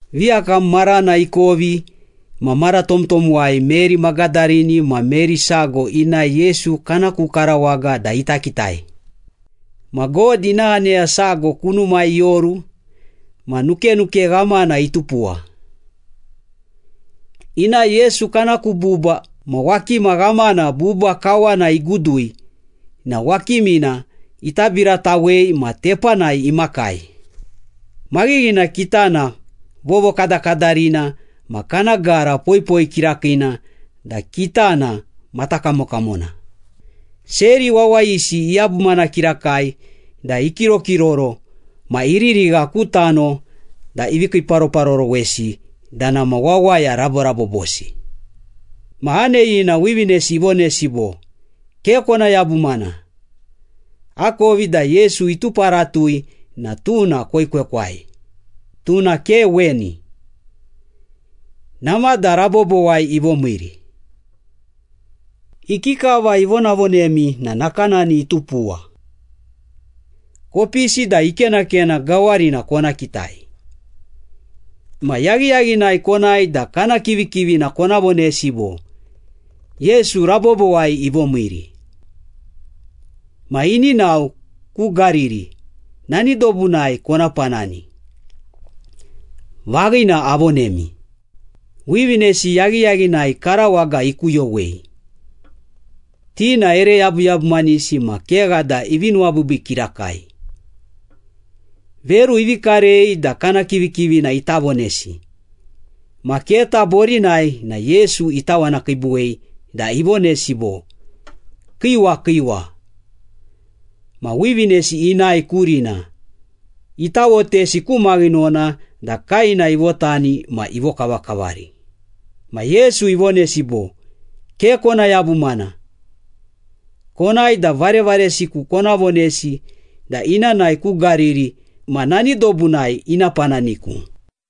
Viyakam marana ikovi ma mara tomtomwai Meri Magadarini ma Meri sago inae Yesu kana ku karawaga da ita kitai. Ma God ina aneya sago kunumai ioru ma nukenuke ghamana itupuwa. Inae Yesu kana ku buba ma wakima ghamana buba kawana igudui na wakimina itabiratawei ma tepanai imakai. Maghighina kitana vovokadakadarina ma kana gara poipoi kirakiina da kitana matakamokamona. Seri wawayisi iyabumana kirakai da ikirokiroro ma iririgha ku tano da ivi kiiparoparorowesi da nama wawaya raborabobosi. Ma aneyina wivinesi ivonesi bo, “Ke kona yabumana. Akovi da Yesu ituparatui na tuna koekwekwai. Tuna ke weni. Namada rabobowai ivomiiri. Ikikava ivonavonemi na nakanani itupuwa. Kopisi da ikenakena gawarina kona kitai. Ma yaghiyaghinai konae da kana kivikivina kona vonesi bo, ‘Yesu rabobowai ivomiiri. Ma ini nao ku Gariri, nani dobunai kona panani.’ Vaghina, avonemi.” Wivinesi yaghiyaghinai karawaga ikuyowei, ti na ere yabuyabumanisi ma kegha da ivi nuwabiibii kirakai. Veru ivi karei da kana kivikivina ita vonesi, ma keta borinai na Yesu itawanakiibuwei da ivonesi bo, “Kiiwa, kiiwa!” Ma wivinesi inae kurina, itawotesi ku maghinona da kaena ivotani ma ivokavakavari. Ma Yesu ivonesi bo, “Ke kona yabumana. Konae da varevaresiku kona vonesi da ina nae ku Gariri ma nani dobunai ina pananiku.”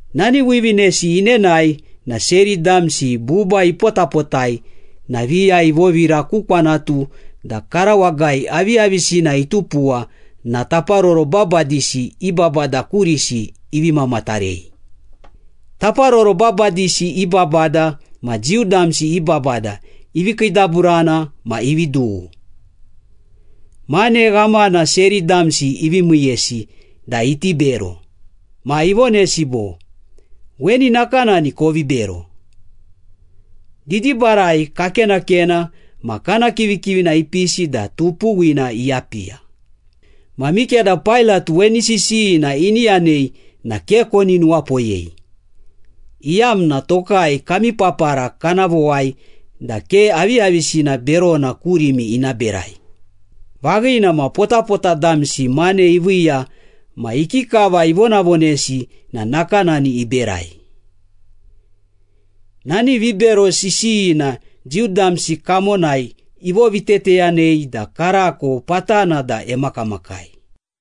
Nani wivinesi inenae na seri damsi buba ipotapotai na viya ivovira ku kwantu da karawagai aviyavisina itupuwa na taparoro babadisi i babada kurisi ivi mamatarei. Taparoro babadisi i babada ma Jiu damsi i babada ivi kiidaburana ma ivi dughu. Mane ghamana seri damsi ivi miiyesi da iti bero. Ma ivonesi bo, “Weni nakanani kovi bero. ‘Didibarai kakenakena ma kana kivikivina ipisi da tupuwina iyapiya.’ Ma mikeda Pailat weni sisiyina ini yanei na ke koni nuwapoyei, iyamna tokai kami papara kana vowai da ke aviyavisina berona kurimi ina berai.” Vaghina ma potapota damsi mane iviiya ma ikikava ivonavonesi na nakanani iberai. Nani vibero sisiyina Jiu damsi kamonai ivoviteteyanei da karako patana da emakamakai.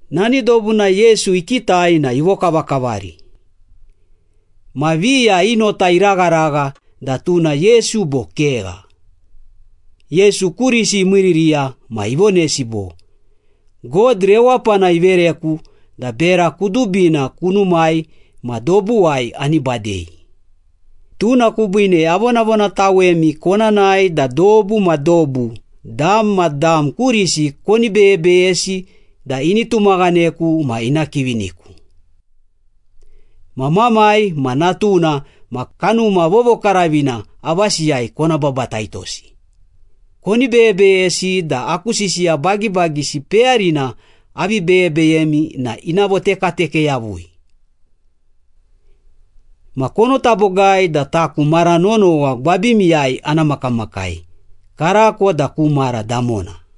Nani dobunai Yesu ikitai na ivokavakavari. Ma viya i nota iragharagha da tuna Yesu bo kegha. Yesu kurisi imiiririya ma ivonesi bo, “God rewapana ivereku da bera kudubina kunumai ma dobuwai ani badei. Tuna kubiine avonavonatawemi kona nae da dobu ma dobu, dam ma dam kurisi koni beyebeyesi da ini tumaghaneku ma ina kiviniku. Ma Mamai ma Natuna ma Kanuma Vovokaravina avasiyai kona babataitosi. Koni beyebeyesi da aku sisiya bagibagisi peyarina avi beyebeyemi na ina votekateke yavui. Ma konota bogai da taku mara nonowa gwabimiyai ana makamakai, karako da ku mara damona.”